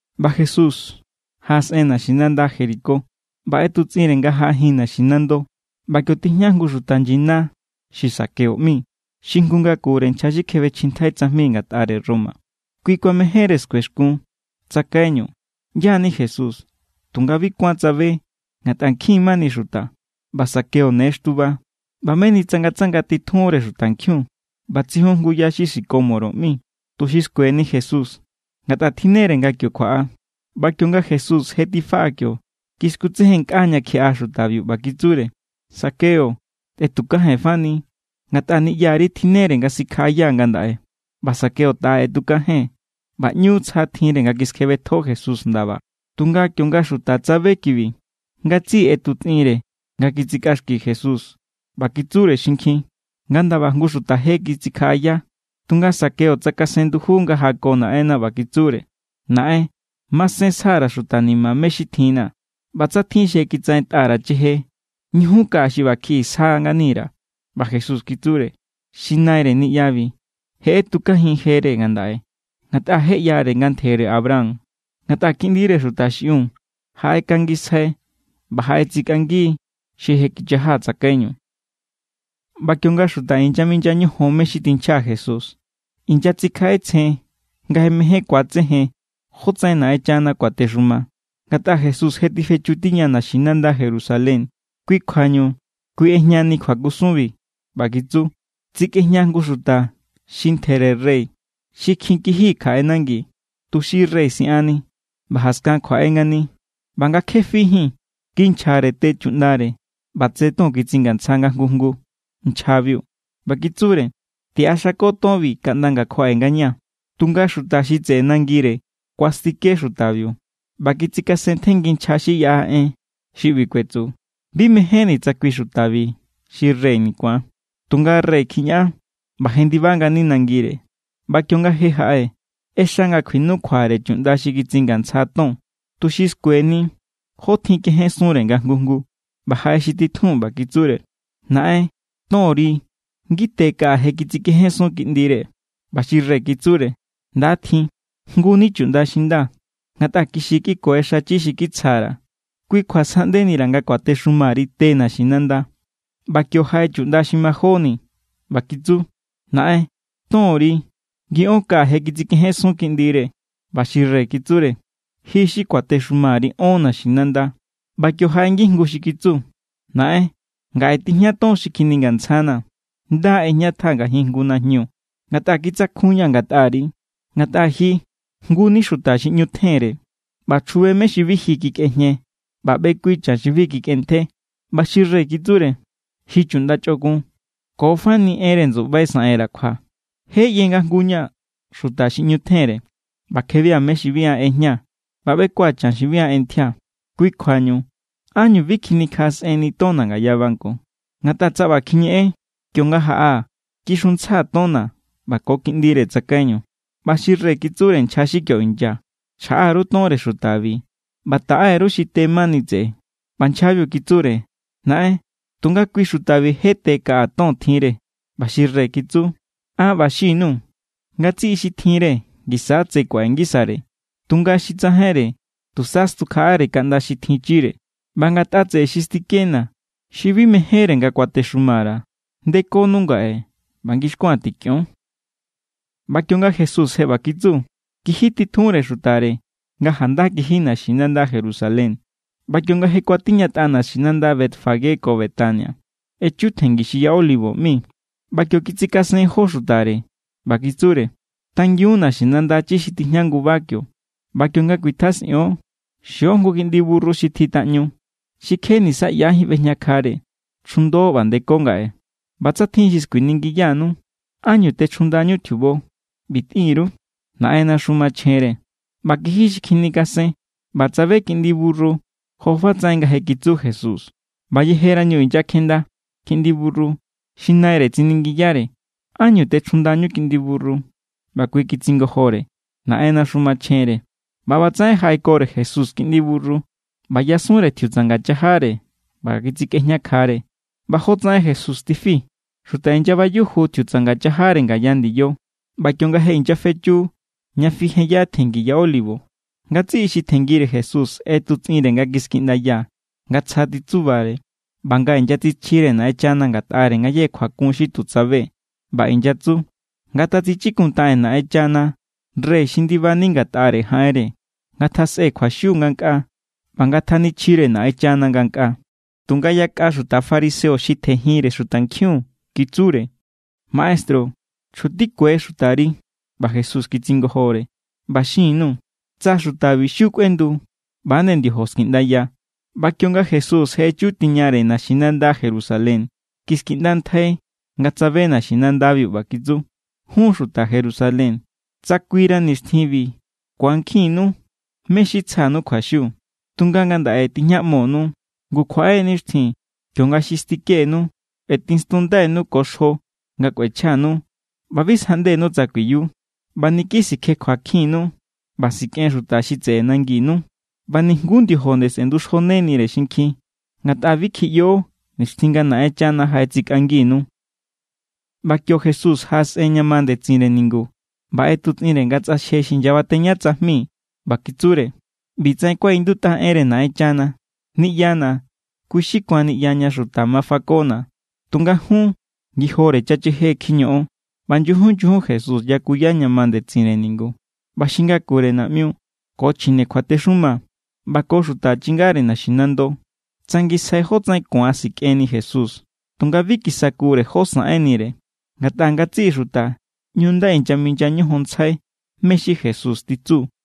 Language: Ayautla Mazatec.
ꞌBa Jesús jaꞌasꞌen naxinanda Jericó ꞌba ꞌetutsꞌinre nga jaꞌajin naxinando. ꞌBa kio tijña jngu xuta nyina xi Zaqueo ꞌmi, xi jngu ngakure nchja xi kjebechjintjai tsajmi ngatꞌare Roma. Kui mejénre skuexkun tsakaiñu ꞌyá= ni Jesús, tunga bi kuán tsabe, ngatꞌa nkjin mani xuta, ꞌba Zaqueo ne xtuba. ꞌBa meni tsangatsanga titjunre xutankjiun ꞌba tsijun jngu ya xi sicómoro ꞌmi, tuxi skueni Jesús, ngatꞌa tjinnere nga kio kjuaꞌa. ꞌBa kionga Jesús je tifaꞌa kio, kiskutsejennkꞌa ña kjiꞌa xutabiu, ꞌba kitsure: —Zaqueo, tetukajenfani, ngatꞌa niꞌyari tjinnere nga sikjaꞌayaa̱ ngandaꞌe. ꞌBa Zaqueo taꞌa ꞌetukajen ꞌba ꞌñu tsja tjinre nga kiskjebetjo Jesús ndaba. Tunga kionga xuta tsabe kibi, ngatsiꞌi ꞌetutsꞌinre nga kitsikꞌaxki Jesús, ꞌba kitsure xinkjin: —Nga ndaba jngu xuta je kitsikjaꞌaya. Tunga Zaqueo tsakasen nduju nga jako Naꞌenna, ꞌba kitsure: —Naꞌen. Masen sja_ra̱ xuta ni̱ma̱ mé= xi tjinna̱. ꞌBa tsa tjin xi je kitsaꞌentꞌa_ra̱ cheje, ñujun kaꞌa xi ꞌba kjiꞌi sja ngani_ra̱. ꞌBa Jesús kitsure: —Xi naire niꞌyabi je ꞌetukajin jere ngandaꞌe ngatꞌa je ꞌyare nga ntjere Abraham. Ngatꞌa Kiꞌndire Xuta xiꞌiun jaꞌekangisjai ꞌba jaꞌetsikꞌangi xi je kichaja tsakaiñu. ꞌBa kionga xuta inyaminya ñojon mé= xi tinchja Jesús, inyatsikjaꞌetsjen nga je mején ku̱atsejen jótsaꞌen Naꞌenchana kuatexuma; ngatꞌa Jesús je tifechu tiña naxinanda Jerusalén. Kui kjuañu, kui ꞌejñani kjuakusunbi. ꞌBa kitsu: —Tsikꞌejña jngu xuta xi ntjere rey xi kjin kiji kjaꞌe nangi, tuxi rey sꞌianni ꞌba jaskan kjuaꞌe ngani. ꞌBa nga kje fijín, kinchjare te chuꞌndare ꞌba tse ton kitsingantsja nga jngu jngu nchjabiu, ꞌba kitsure: “Tiꞌaxako tonbi kaꞌnda nga̱ kjuaꞌe ngañaa̱.” Tunga xuta xi tseꞌe nangire kuastike xutabiu ꞌba kitsikasentjenngi nchja xi yaꞌa en xi ꞌbi kuetsu: “Bi mejénni̱ tsa kui xutabi xi reyni̱ ku̱an.” ’Tunga rey kjiñaꞌan ꞌba jendiba ngani nangire. ꞌBa kionga je jaꞌe, ꞌexa nga kjuinukjuare chuꞌnda xi kitsingantsja ton, tuxi skueni jó tjin kejensunre nga jngu jngu. ꞌBa jaꞌe xi titjun, ꞌba kitsure: “Naꞌen, tonri ngite kaꞌa je kitsikejensun kiꞌndire.” ꞌBa xi rey kitsure: “Nda tjin, jngu ni chuꞌnda xi nda. Ngatꞌa kixi= kꞌiku̱e xachi xi kitsjare, kui kjua sjaꞌndeira̱ nga kuatexumari te naxinanda.” ꞌBa kio jaꞌe chuꞌnda xi majóni, ꞌba kitsu: “Naꞌen, tonri ngiꞌón kaꞌa je kitsikejensun kiꞌndire.” ꞌBa xi rey kitsure: “Ji xi kuatexumari ón naxinanda.” ’ꞌBa kio jaꞌe ngijngu xi kitsu: “Naꞌen, ngaꞌe tijña ton xi kjiningantsjanaa̱. Nda= ꞌejñatjaa̱ ngajin jngu najñu; ngatꞌa kitsakjunña̱ ngatꞌari. Ngatꞌa ji jngu= ni xuta xi ꞌñu tjenre, ꞌba chjube mé= xi bi ji kikꞌejñe, ꞌba ꞌbekui chan xi bi ji kikꞌentje.” ꞌBa xi rey kitsure: “Ji chuꞌnda chꞌokun. Ko fani enre ndsuꞌbai saꞌenra̱ kjua. Je ꞌye nga an jngu= ña̱ xuta xi ꞌñu tjenre, ꞌba kjebia̱ mé= xi bi an ꞌejñaa̱, ꞌba ꞌbekua̱ chan xi bi an ꞌentjía̱. Kui kjuañu ¿ánñu bi kjinikjaꞌasꞌenni tonna̱ ngaya banco? Ngatꞌa tsa ꞌba kjiñeꞌen, kionga jaꞌaa̱, kixuntsjaa̱ tonna̱ ꞌba ko kiꞌndire tsakaiñu.” ꞌBa xi rey kitsure nchja xi kio inya: “Chjaꞌá_ru tonre xutabi ꞌba taꞌe_ru xi te mani tseꞌe.” ꞌBa nchjabiu kitsure: “Naꞌen, tunga kui xutabiu je te kaꞌa ton tjinre.” ꞌBa xi rey kitsu: “An ꞌba xin_nuu̱. Ngatsiꞌi xi tjinre ngisa= tse kuaꞌe ngisare, tunga xi tsajainre, tusa stjukjaꞌare kaꞌnda xi tjinchire. ꞌBa ngatꞌa tseꞌe xi stikena̱, xi bi mejénre nga kuatexuma_ra̱, ndekonu ngaꞌe ꞌba ngixkua̱n tikꞌion.” ꞌBa kionga Jesús je ꞌba kitsu, kijitjunre xutare nga janda kiji naxinanda Jerusalén. ꞌBa kionga je kuatiñatꞌare naxinanda Betfagé ko Betania, echu tjenngi xi Ya Olivo ꞌmi. ꞌBa kio kitsikasen jó xutare. ꞌBa kitsure: —Tangiun naxinanda chi xi tijña nguba kio, ꞌba kionga kuitjasꞌion, xio jngu kiꞌndi burru xi tjitaꞌñu, xi kje nisa ꞌyajín ꞌbejñakjare. Chjundo ꞌba ndeko ngaꞌe. ꞌBa tsa tjin xi skuiningiyanu: “¿Ánñu techjundañú tjiubo?”, ꞌbi tꞌin_ru: “Naꞌennaxu machjenre.” ꞌBa kiji xi kjinikasen, ꞌba tsabe kiꞌndi burru jofatsaꞌen nga je kitsu Jesús. ꞌBa yejerañu inyakjenda kiꞌndi burru, xi naire tsiningiyare: —¿Ánñu techjundañú kiꞌndi burru? ꞌBa kui kitsingojore: —Naꞌennaxu machjenre. ꞌBa ꞌbatsaꞌen jaꞌekore Jesús kiꞌndi burru, ꞌba yasunre tjiutsanga chajare ꞌba kitsikꞌejñakjare. ꞌBa jotsaꞌen Jesús tifi, xuta inyabayuju tjiutsanga chajare ngaya ndiyo. ꞌBa kionga je inyafechu ña fijenya tjenngi Ya Olivo, ngatsiꞌi xi tjenngire Jesús ꞌetutsꞌinre nga kiskiꞌndaya nga tsja titsubare ꞌba nga inyatsichjire Naꞌenchana ngatꞌare ngayéje kjuakun xi tu tsabe. ꞌBa inyatsu: —¡Ngatatsichikuntaꞌen Naꞌenchana rey xi ndibani ngatꞌare jaꞌenre! ¡Ngatjasꞌe kjuaxiu ngankꞌaa, ꞌba ngatjanichjire Naꞌenchana ngankꞌaa! Tunga yakꞌa xuta fariseo xi tjenjinre xutankjiun kitsure: —Maestru, chjutikue xutari. ꞌBa Jesús kitsingojore: —ꞌBa xin_nuu̱ tsa xutabi xiu kꞌuendu, ꞌba=nde ndiojo skiꞌndaya. ꞌBa kionga Jesús je echu tiñare naxinanda Jerusalén, kiskiꞌndantjai nga tsabe naxinandabiu. ꞌBa kitsu: —¡Jún, xuta Jerusalén, tsa kuira nixtjinbi ku̱ankjinnu mé= xi tsja_nuu̱ kjuaxiu! Tunga ngandaꞌe tijñaꞌmonu. Ngu kjuaꞌe nixtjin kionga xi stikenu kꞌuetinstundainu ko xjo nga kꞌuechjanu, ꞌba bi sjaꞌndenu tsa kuiyu. ꞌBa niki sikjekjuakjinnu ꞌba sikꞌen xuta xi tseꞌe nanginu. ꞌBa nijnguú ndiojo nde sꞌe̱nduxjonenire xinkjin. Ngatꞌa bi kjiꞌyo nixtjin nga Naꞌenchana jaꞌetsikꞌanginu. ꞌBa kio Jesús jaꞌasꞌen ña ma ndetsinre ningu ꞌba ꞌetutsꞌinre nga tsꞌaxje xi inyabateña tsajmi. ꞌBa kitsure: —ꞌBitsaꞌen kuaꞌindutꞌa enre Naꞌenchana: “Niꞌyana̱, kui= xi ku̱an niꞌya ña xuta ma fakona̱.” Tunga jun, ngijore chacheje kjiñoꞌon. ꞌBa nyujun nyujun Jesús yakuya ña ma ndetsinre ningu. ꞌBa xi ngakure naꞌmiu ko chjine kjuatexuma ꞌba ko xuta chingare naxinando tsangisjai jótsaꞌen ku̱an sikꞌenni Jesús. Tunga bi kisakure jó saꞌenire, ngatꞌa ngatsiꞌi xuta ꞌñu nda inyaminya ñojonntsjai mé= xi Jesús titsu.